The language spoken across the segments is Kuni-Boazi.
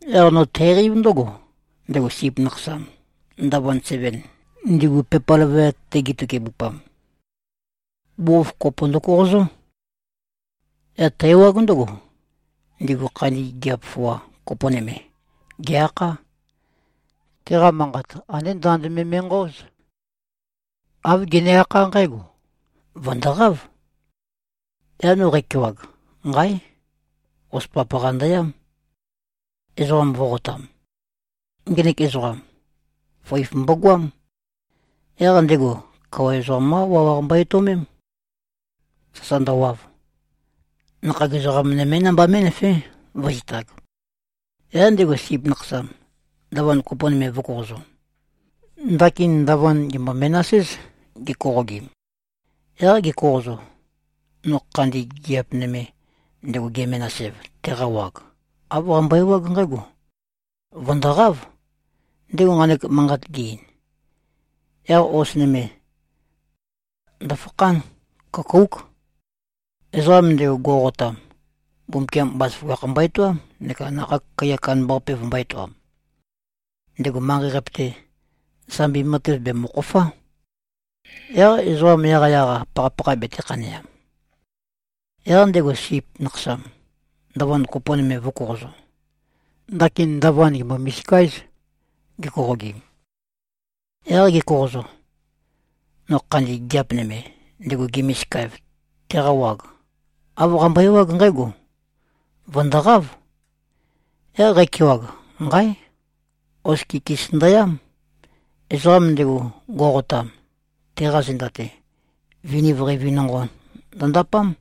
Yaq no tæqeív ndǿgo: Ndego Sip Nakhasam, ndavand seven, ndigu pepa løvøyat-te gitøkebupam, bugukhokhof kopo ndøkoqozó. Yaq tæ-ewág ndǿgo, ndigu khandi gigiap foa, kopo nøme, gè-akhá. Teqa manqat andé ndand me me꞉nqøóz. Āv gene-akhá nqǽgo, “Vø̀ndoqáv.” Yaq no qækewag, nqáe! Hos papaqa ndøyám, ezoqam vō꞉qotam. Ngenek ezoqam, føif mbogoám. Yaq ndego, kawa ezoqam-qá wawaq mbo-etøomém, sasa ndøwav. Nakhag ezoqam nømé namba mé꞉nøfé, vǿzitāg. Yaq ndego Sip Nakhasam, ndavand kopo nøme vø̄koqozo. Ndakin ndavand gèmbo-menas-éz, gekoqogim. Yaq ge꞉koqozo, no khandi gigiap nøme, ndego ge-menas-ev, teqa wag, āv qambøe-ewág nqǽgo, “Vø̀ndoqáv.” Ndego nqanek manqat ge-ein, yaq hos nøme ndofakhán. Køkóuk. Ezoqam ndego, go꞉qotam, Mbumbukiam bazaføgakh mbo-etoám neka nakhag kaiya kandambaqape vømbō-etoam. Ndego manqei-qape-te, sambi matev bèmøkhofá, yaq ezoqa yaqyaq-a pakhapakha betē-khaneam. Yaq ndego Sip Nakhasam, ndavand kopo nøme vø̄koqozo. Ndakin ndavand gèmbo-misika-éz, gekoqogim. Yaq ge꞉koqozo, no khandi gigiap nøme, ndego ge-misika-ev, teqa wag, āv qambøe-ewág nqǽgo, “Vø̀ndoqáv.” Yaq qækewag, nqáe! Hos kikis ndøyám. Ezoqam ndego, go꞉qotam, teqa zenda-te, viniv qeivi nonqo ndøndapám.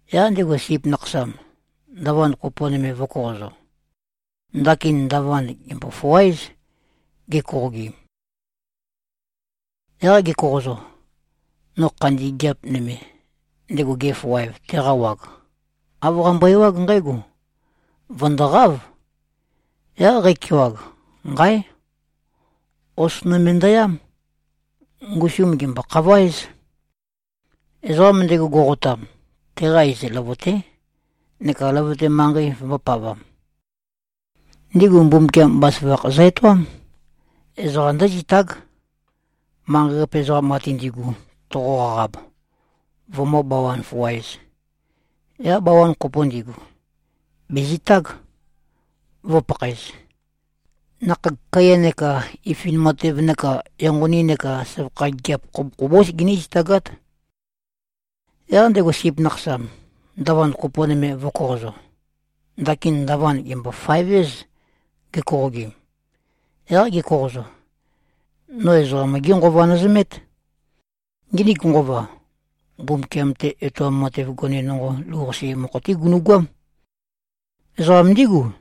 Yaq ndego Sip Nakhasam, ndavand kopo nøme vø̄koqozo. Ndakin ndavand gèmbo-foa-éz, gekoqogim. Yaq ge꞉koqozo, no khandi gigiap nøme, ndego ge-foa-ev, teqa wag, āv qambøe-ewág nqǽgo, “Vø̀ndoqáv.” Yaq qækewag, nqáe! Hos nøme ndøyám. Ngusum gèmbo-khavøéz. Ezoqam ndego go꞉qotam, teqa iz Løvøté, neka løvøte manqei vømbōpavam. Ndigu Mbumbukiam bazaføgakh zø-etoám. Ezoqa ndǿzitág. Manqei-qape ezoqam ate ndi꞉gu toqo-qaqab, vømǿ-bawan-foa-ēz, yaq bawan kopo ndigu, bèzitág, vǿpakhaēz. Nakhag kaiya neka ifin matev neka enqoni neka søvakha gigiap khobokhobós giní-zitagát. Yaq ndego Sip Nakhasam, ndavand kopo nøme vø̄koqozo. Ndakin ndavand gèmbo-faev-éz, gekoqogim. Yaq ge꞉koqozo, no ezoqam-gí nqova nøzømét. Nginik nqova, Mbumbukiam-te etoam matev gone nonqo lou-qase mokho-té gunu꞉goám. Ezoqam ndígu,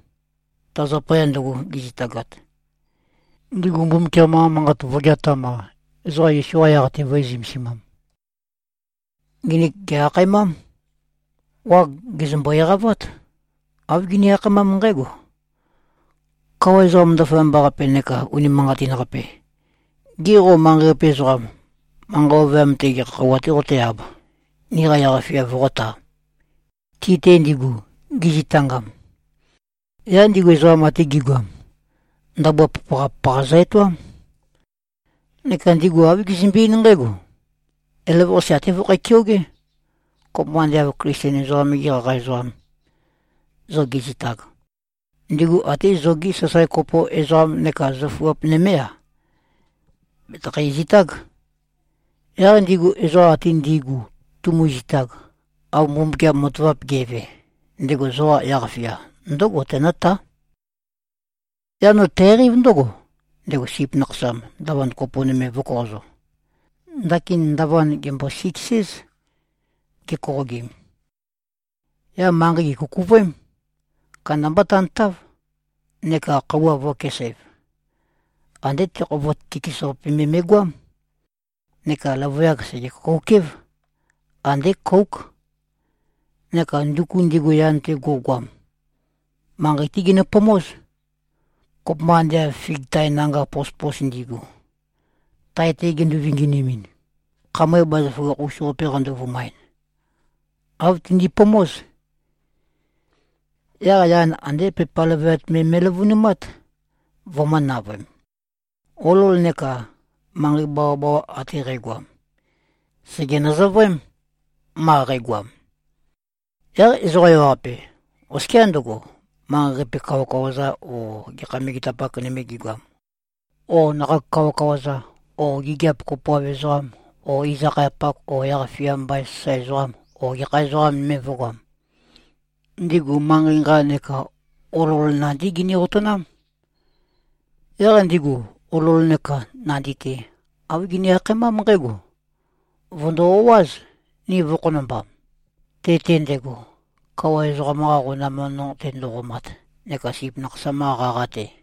ta zapaya ndøgo gi꞉zitagat, ndigu Mbumbukiam-qa Manqat vø̄geatam-a, ezoqa Yesu-qa yaq-te vø̄e-zømesimam. Nginik gè-akhaemám. Wag gèzømbo-eqavát. Āv gini-akhaemám nqǽgo, “Kawa ezoqam ndaføyamba-qape neka unimanqatin-qape! Gê, qo manqei-qape ezoqam, manqa ovøyam-te gekha khøuwa-tē qoté-āb, niqa yaq-fia voqótā, ti-te ndigu, gizitangam?” Yaq ndigu ezoqa ate gi꞉goam, ndabua papaqa-papaqa zø-etoám. Neka ndigu āv gizømbe-eín nqǽgo, “Elavøqase até vøkhæ-keogé. Kopømba ande av Klisten ezoqam-gi qaqa ezoqam, zo ge꞉zitag, ndigu até zogi sasae kopo ezoqam neka zøfuap nømé-a, bètøkho-zitág. Yaq ndigu ezoqa ate ndi꞉gu tumuzitag, av Mbumbukiam matavap ge꞉ve, ndego zoqa yaq-fia ndǿgo tenǿtá.” Yaq no tæqeív ndǿgo: Ndego Sip Nakhasam, ndavand kopo nøme vø̄koqozo. Ndakin ndavand gèmbo-siks-éz, gekoqogim. Yaq manqei gèkukuvøém. Kandambá tantáv. Neka khøuwa vø̄kesæv. Andé tekhovot kikis-qape me me꞉goám. Neka løvøyak sège-køkouk-év. Andé kóuk. Neka nduku ndigu yan-te go꞉goam, manqei-té ginøpomóz. Kopømba ande av fig tae nanga pospos ndi꞉gu, tae-te gindu-vinginimin, khamøe bazaføgakh-us-qape qando-vumaɨn, āv tindipomóz. Yaq yan andé pepa løvøyat me me꞉løvønumát, vømø̄-navøem. Olol neka manqei bawabawa ate qægoam, sège-nøzøvøém, ma qægoam. Yaq ezoqa ewaqape, oskiá ndøgo, manqei-qape kawakawa-za o gekha megetapak nøme gigoam, o nakhag kawakawa-za o gigiap kopoav ezoqam o iz-akhayapak o yaq-fia mbain sasae ezoqam o gekha ezoqa nøme vø̄goam, ndigu manqei nqa neka olol nandí gini-otønám. Yaq ndigu, olol neka nandi-te, āv gini-akhaemám nqǽgo, “Vø̀ndo-o꞉áz, ni vø̄-khonombam, te-te ndego, kawa ezoqam-qa qonam nonqo-te ndo꞉qomat neka Sip Nakhasam-qa qaqa-te.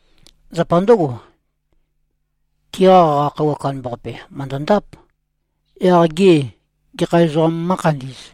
Zapa ndǿgo, tiqa qaqa khøuwa kandambaqape mø̀ndøndáp. Yaq gê, gekha ezoqām mǿkhandī꞉z?”